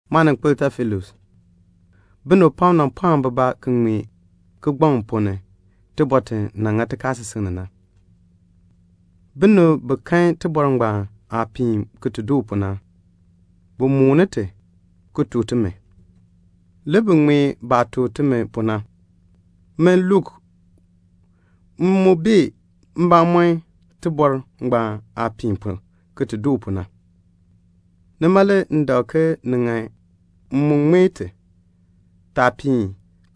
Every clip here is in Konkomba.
Maaninkpil Teofilus, binib pam nan pɔɔ bibaa ki ŋmee kigbaŋ ponn ni tibɔr ti nan ŋa tikaasisik ni na. Binib bi kan tibɔr ngbaan aah piin ki ti doo pu na, bi mooni ti, ki tuk timi. Le bi ŋmee baah tuk timi pu na. Min Luk, m mu bee mbamɔm tibɔr ngbaan aah piin pu, ki ti doo pu na. Nima le m dak ke ni ŋan m mu ŋmee ti, taah piin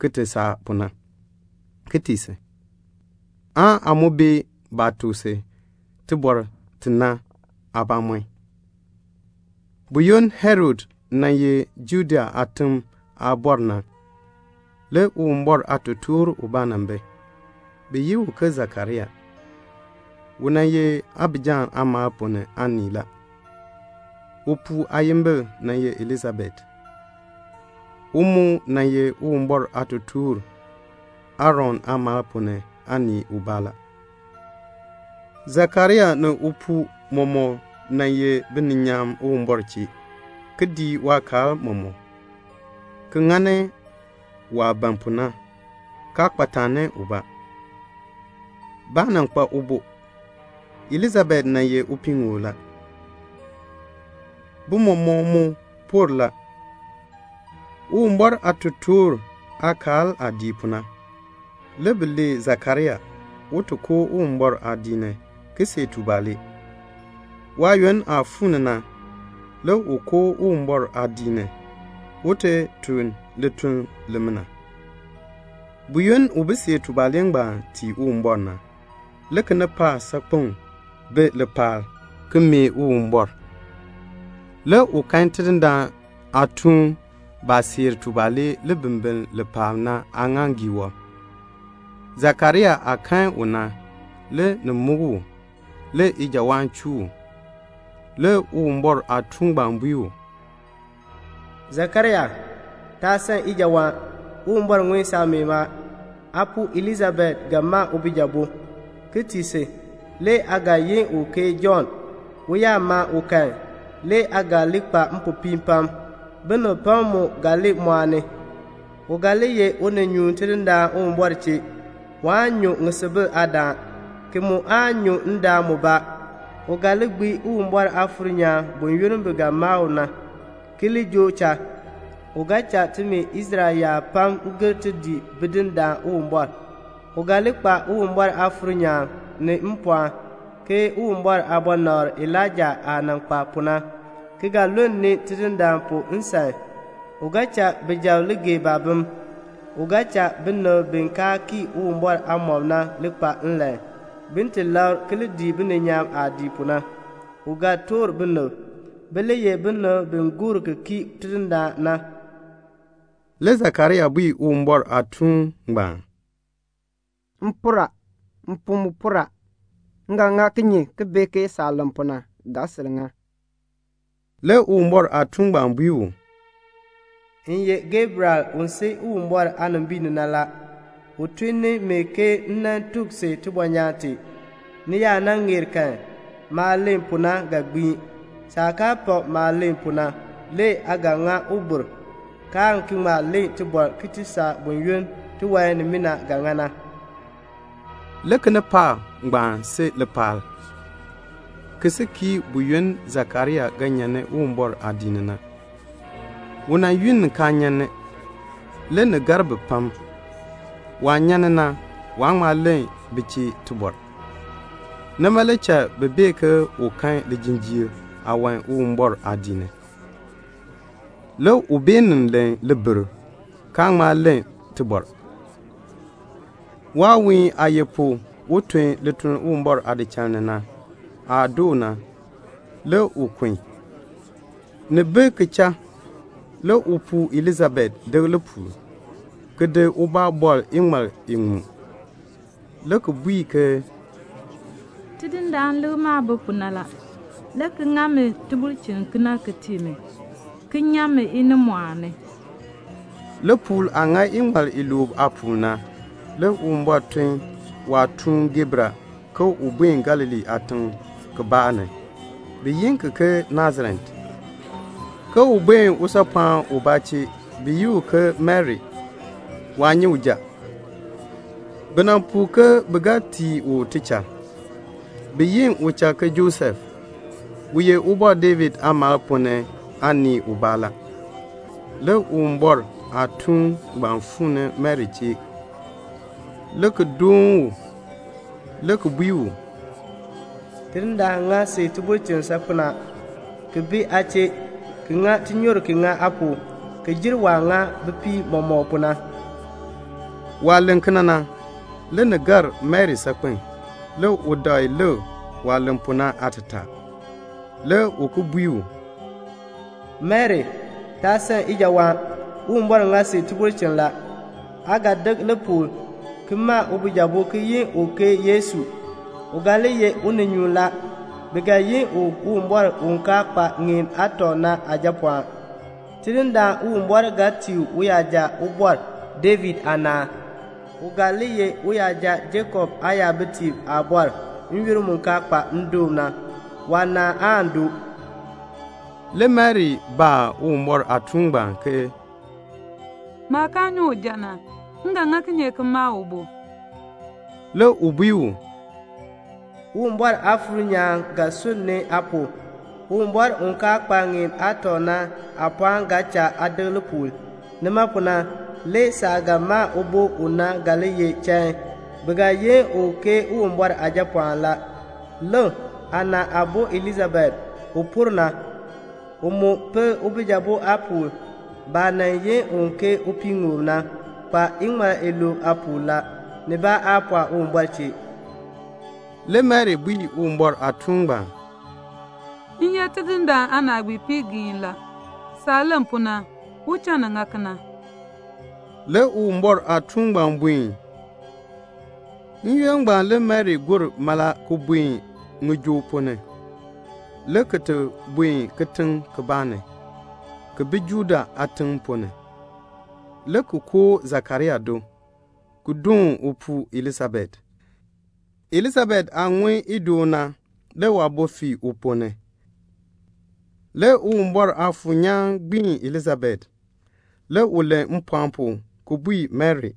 ki ti saa pu na, ki tii si, aan aa mu bee baah tuk si tibɔr ti na aabamɔn. Buyoonn Herod nan ye Judea aatiŋ aabɔr na, le Uwumbɔr aatotoor ubaa nan bi, bi yi u ke Sakaria. U nan ye Abija aamaal ponn ni aanii la. Upuu aayimbil nan ye Elisabet. U mu nan ye Uwumbɔr aatotoor Aaron aamaal ponn ni aanii ubaa la. Sakaria ni upuu mɔmɔk nan ye bininyaan Uwumbɔr chee, ki dii waakaal mɔmɔk, ki ŋani waah ban pu na, kaa kpa taani ubaa. Baa nan kpa ubo. Elisabet ye upiiŋoob la. Bi mɔmɔk mu por la. Uwumbɔr aatotoortiib aakaal aah dii pu na, le bi lee Sakaria, un ti koo Uwumbɔr aadiik ni, ki ti see tubalee. Waayoonn aah fuu ni na, le u koo Uwumbɔr aadiik ni, un ti tun lituln limina. Buyoonn u bi seer tubalee ngbaan tii Uwumbɔr na, le kinipaak saakpeŋ bi lipaal, ki mee Uwumbɔr. Le u kan Tidindaan Uwumbɔr aatuun baah seer tubalee libimbiln li paab na aaŋaaŋgii wɔb. Sakaria aah kan u na, le ni muk u, le u san ijawaan. Le Uwumbɔr aatuun ngbaan bui u, "Sakaria, taa san ijawaan. Uwumbɔr ŋun saameen a. Aapuu Elisabet ga ma ubijabo, ki tii si. Le aa ga yin u ke Jɔnn. U yaa ma u kan, le aa ga li kpa mpopiin pam. Binib pam mu ga li mɔɔni. U ga li ye uninyuun Tidindaan Uwumbɔr chee. Waan nyu ŋisubil aadaan, ki mu aan nyu ndaan mubaa. U ga gbiin Uwumbɔr Aafuur nyaan buyoonn bi ga ma u na, ki li joo cha. U ga giin nimi Israel yaab pam bin ki gir ti dii Bidindaan Uwumbɔr. U ga li kpa Uwumbɔr Aafuur nyaan, ni mpɔɔn, ke Uwumbɔr aabɔnabr Elaija aah nan kpa pu na, ki ga lulni Tidindaan pu nsan. U ga cha bijab li gee baabim. U ga cha binib bi kaa kii Uwumbɔr aamɔb na li kpa nlan, bin ti labr, ki li dii bininyaan aah dii pu na. U ga toor binib, bi li ye binib bi gor ki kii Tidindaan na." Le Sakaria bui Uwumbɔr aatuun ngbaan, "M por a, mpuu mu por a; m ga ŋa kinye ki bee ki ni ga sil ŋa saah len pu na." Le Uwumbɔr aatuun bui u, "M ye Gabriel u si Uwumbɔr aanimbiin ni na. U tun ni mi ke m tuk si tibɔnyaan tee. Ni yaa nan ŋeer kan, maah len pu na ga gbiin. Saah kaa pak maah len pu na, le aa ga ŋa ubir, kaan ki ŋma len tibɔr ki ti saa buyoonn tiwan nimina ga ŋa na." Le kinipaak ngbaan si lipaal, ki si kii buyoonn Sakaria ga nyan ni Uwumbɔr aadiik ni na. U yunn kaa nyan ni, le ni gar bi pam. Waah nyan ni na, waa ŋma len bi chee tibɔr. Nima le cha bi bee ke u kan lijinjiir aawan Uwumbɔr aadiik ni. Le u beenin len libir, kaa ŋma len tibɔr. Waawiin aah ye pu, un tun lituln Uwumbɔr aadichal ni na, aah doo na, le u kun. Ni bi ki cha, le upuu Elisabet dek lipuul, ki bɔr ubaa iŋmal iŋmu, le ki bui ke, "Tidindaan Uwumbɔr lik maah bi pu na la, le ki ŋa mi tibulchin kena ki tii mi, ki nyan mi inimɔɔn ni." Lipuul aah ŋa iŋmal iluub aapuul na, le Uwumbɔr tun ni waatuun Gabriel un buen Galilee aatiŋ kibaa ni, bi yi ki ke Nasaret, ke un buen usaapɔɔn ubaa chee, bi yi u ke Mari. Waa nyi uja. Bi nan puu ke bi ga tii u tichal. Bi yi uchal Josef, u ye Ubɔr David aamaal ponn ni aanii ubaa la. Le Uwumbɔr aatuun ngbaan fuu ni Mari chee le ki doon u, le ki bui u, "Tidindaan Uwumbɔr ŋa si tibulchin saakpen a, ki bi aa chee, ki ŋa tinyoor ki ŋa aa pu, ki jer waah ŋa bipiib mɔmɔk pu na." Waah len kena na, le ni gar Mari saakpen. Le u dakl lik waah len pu na aatataa. Le u ki bui u, "Mari, taa san ijawaan. Uwumbɔr ŋa si tibulchin la. Aa ga dek lipuul, ki ma ubijabo ki yi u ke Yesu. U ga li ye uninyuun la. Bi ga yi u Uwumbɔr u kaa kpa ŋeen aatɔ na Aajapɔɔn. Tidindaan Uwumbɔr ga tii u uyaja Ubɔr David aanaan. U ga li ye uyaja Jakob aayabitiib aabɔr n-yoonn mu kaa kpa ndoon na. Waanaan aan doo." Le Mari baa Uwumbɔr aatuun ngbaan ke, "Maah kaa nyi uja na, m ga ŋa kinye ki ma ubo?" Le u bui u, "Uwumbɔr Aafuur nyaan ga sunn ni aa pu. Uwumbɔr u kaa kpa ŋeen aatɔ na aapɔɔn ga cha aa dek lipuul. Nima pu na le saah ga ma ubo u na ga li ye chain. Bi ga yi u ke Uwumbɔr Aajapɔɔn la. Lik, aana aabo Elisabet, u por na, u mu pil ubijabo aapuul. Baah nan yi u ke upiiŋoob na, kpa iŋmal iluub aapuul la; nibaa aa pɔɔ Uwumbɔr chee." Le Mari bui Uwumbɔr aatuun ngbaan, "M ye Tidindaan Uwumbɔr aanaagbiipii la. Saah len pu na, u cha ni ŋa kena." Le Uwumbɔr aatuun ngbaan buen. N-yoonn ngbaan le Mari gor mala ki buen ŋijoo ponn ni, le ki ti buen kitiŋ kibaa ni, ki bi Juda aatiŋ ponn ni, le ki koo Sakaria do, ki doon upuu Elisabet. Elisabet aah ŋun idoon na, le waabo fii uponn ni. Le Uwumbɔr Aafuur nyaan gbiin Elisabet. Le u len mpɔɔn pu ki bui Mari,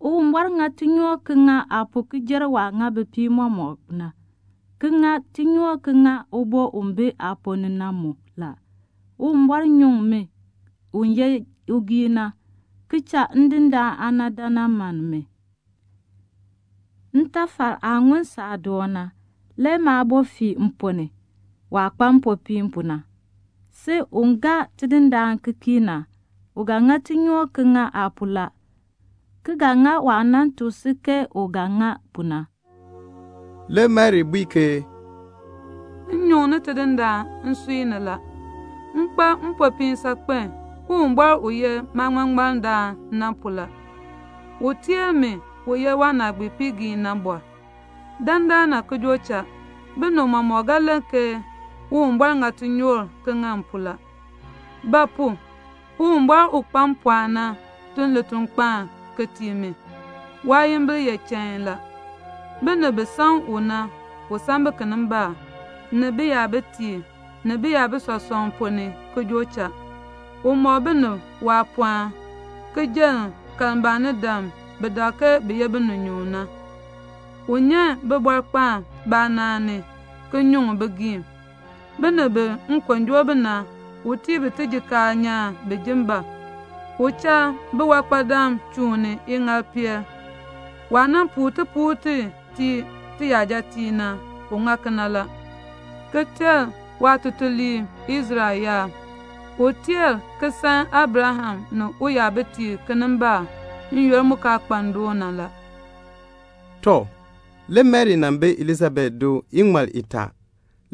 "Uwumbɔr ŋa tinyoor ki ŋa aa pu ki jer waah ŋa bipiib mɔmɔk pu na, ki ŋa tinyoor ki ŋa ubo u bi aaponn ni na mu la. Uwumbɔr nyuŋ mi u ye ugiin na, ki cha Tidindaan aana dan nan mann mi. Ntafal aah ŋun saadoon na, le maabo fii mponn ni, waah kpa mpopiin pu na. Si u gaa Tidindaan Uwumbɔr ki kii na, u ŋa tinyoor ki ŋa aa pu la, ki ga ŋa waah nan tuk si ke u ga ŋa pu na." Le Mari bui ke "M nyuŋni Tidindaan Uwumbɔr nsui ni la. M kpa mpopiin saakpen, Uwumbɔr u ye maaŋmaŋmardaan na pu la. U teer mi, u ye waanaagbiipiigiin na. Dandana ki joo cha, binib mɔmɔk ga len ke Uwumbɔr ŋa tinyoor ki ŋa m pu la, ba pu? Uwumbɔr u kpa mpɔɔn na tun litukpaan ki tii mi. Waayimbil ye chain la. Binib bi san u na, u san bi kinimbaak, ni biyabitiib, ni biyabitiib ponn ni ki joo cha. U mɔk binib waapɔɔn, ki jenn kalmbaanidam bi dak ke bi ye bininyuun na. U nyan bibɔrkpaan baanaan ni, ki nyuŋ bigiim la. Binib bi nkon joo bi na, u tii bi tijikaar nyaan, bin ji bab. U cha biwankpadam chuun ni iŋaalpeel. Waah nan puu tipuul ti ki tii tiyajatiib na, u ŋa kena la, ki ter waatutuliib Israel yaab. U teer ki san Abraham ni uyabitiib kinimbaak n-yoonn mu kaa kpa ndoon na la." Tɔ, le Mari nan bi Elisabet do iŋmal itaa,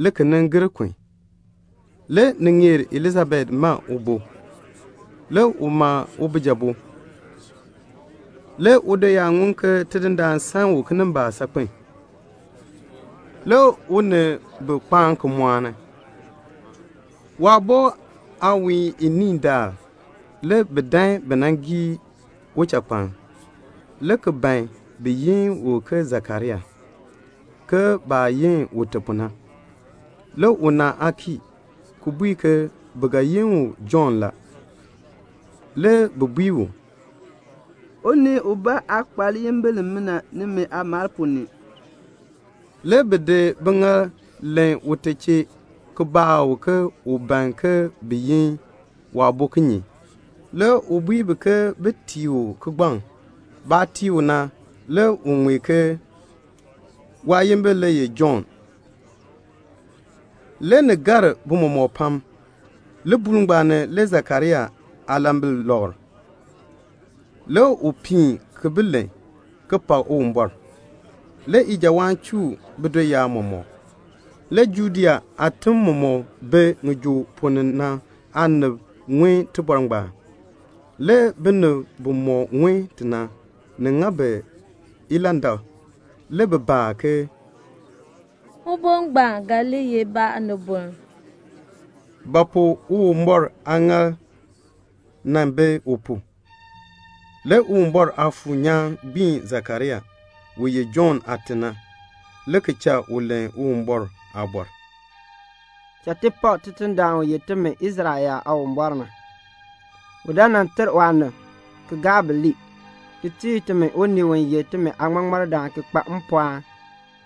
le ki gir kun. Le ni ŋeer Elisabet ma ubo. Le u ma ubijabo. Le udoyaab ŋun ke Tidindaan Uwumbɔr san u kinimbaak saakpen. Le u ni bi kpaan ki mɔɔni. Waabo aawiin iniin daal, le bi dan bi nan gii uchakpaln, le ki ban bin yi u ke Sakaria, ke baah yi ute pu na. Le una aa kii, ki bui ke bi ga yi u Jɔnn la. Le bi bui u, "Unii ubaa aa kpa liyimbil limina nimi aamaal ponn ni." Le bi di biŋaal len ute chee, ki baa u ke u ban ke bin yi waabo kinye. Le u bui bi ke bin tii u kigbaŋ. Baah tii u na, le u ŋmee ke, "Waayimbil le ye Jɔnn." Le ni gar bi mɔmɔk pam. Libuul ngbaan ni le Sakaria aalambil lɔkr. Le u piin ki bi len, ki pak Uwumbɔr. Le ijawaan chuu bidoyaab mɔmɔk. Le Judea aatim mumɔk bi ŋijoo ponn ni na aanib ŋun tibɔr ngbaan. Le binib bimɔk ŋun ti na, ni ŋa bi ilandak. Le bi baa ke, "Ubo ngbaan ga li ye ba aaniboln?" Le Tidindaan Uwumbɔr aaŋaal mu bi u pu. Le Uwumbɔr Aafuur nyaan gbiin Sakaria, u ye Jɔnn aate na, le ki cha u len Uwumbɔr aaliin: "Cha ti pak Tidindaan u ye timi Israel yaab Aawumbɔr na. U dan nan ter waanib, ki gaa bi lii, ki tii timi unii u ye timi aaŋmaŋmardaan ki kpa mpɔɔn,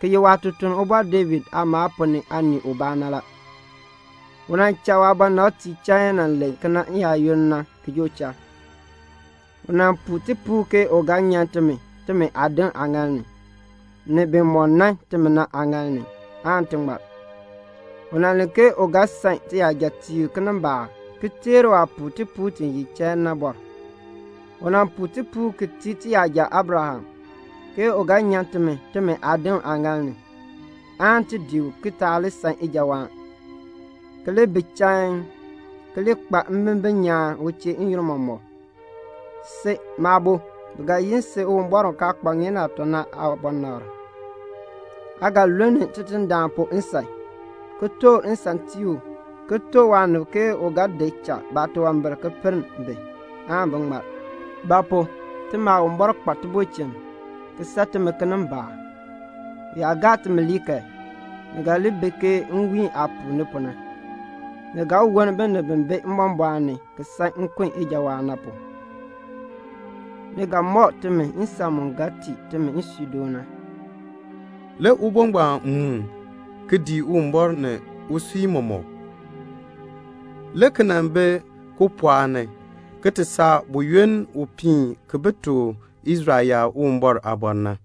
ki ye waatutuln Ubɔr David aamaal ponn ni aanii ubaa na la. U nan cha waabɔnabtiib chain len kena n-yaayoonn na ki joo cha. U nan puu tipuul ke u ga nyan timi timi aadim aaŋaal ni, ni bimɔk nan timi na aaŋaal ni, ti ŋmar. U nan len ke u ga san tiyajatiib kinimbaak, ki teer waah puu tipuul ti ye chain na. U nan puu tipuul ki tii tiyaja Abraham, ke u ga nyan timi timi aadim aaŋaal ni, aan ti dii u ki taa li san ijawaan, ki li bi chain, ki li kpa mbimbin nyaan u chee n-yoonn mɔmɔk. "Si, maabo, bi ga yi si Uwumbɔr u kaa kpa ŋeen aatɔ na aabɔnabr. Aa ga lulni Tidindaan pu nsan, ki toor nsan tii u, ki tuk waanib ke u ga di cha baatunwambir ki pinn bi, bin ŋmar; ba pu? timi Aawumbɔr kpa tibulchin, ki san timi kinimbaak. U yaa gaa timi ke ti ŋmar kan, ni ga li bi ke nwiin aah puuni pu na. Ni ga woln binib bi bi mbɔmbɔɔn ni ki san nkun ijawaan na, ni ga mɔk timi nsan mu ga tii timi nsuudoon na." Le ubo ngbaan muun, ki dii Uwumbɔr ni usui mɔmɔk, le ki nan bi kipɔɔk ni, ki ti saa buyoonn u piin ki tuk Israel yaab Uwumbɔr aaliin na.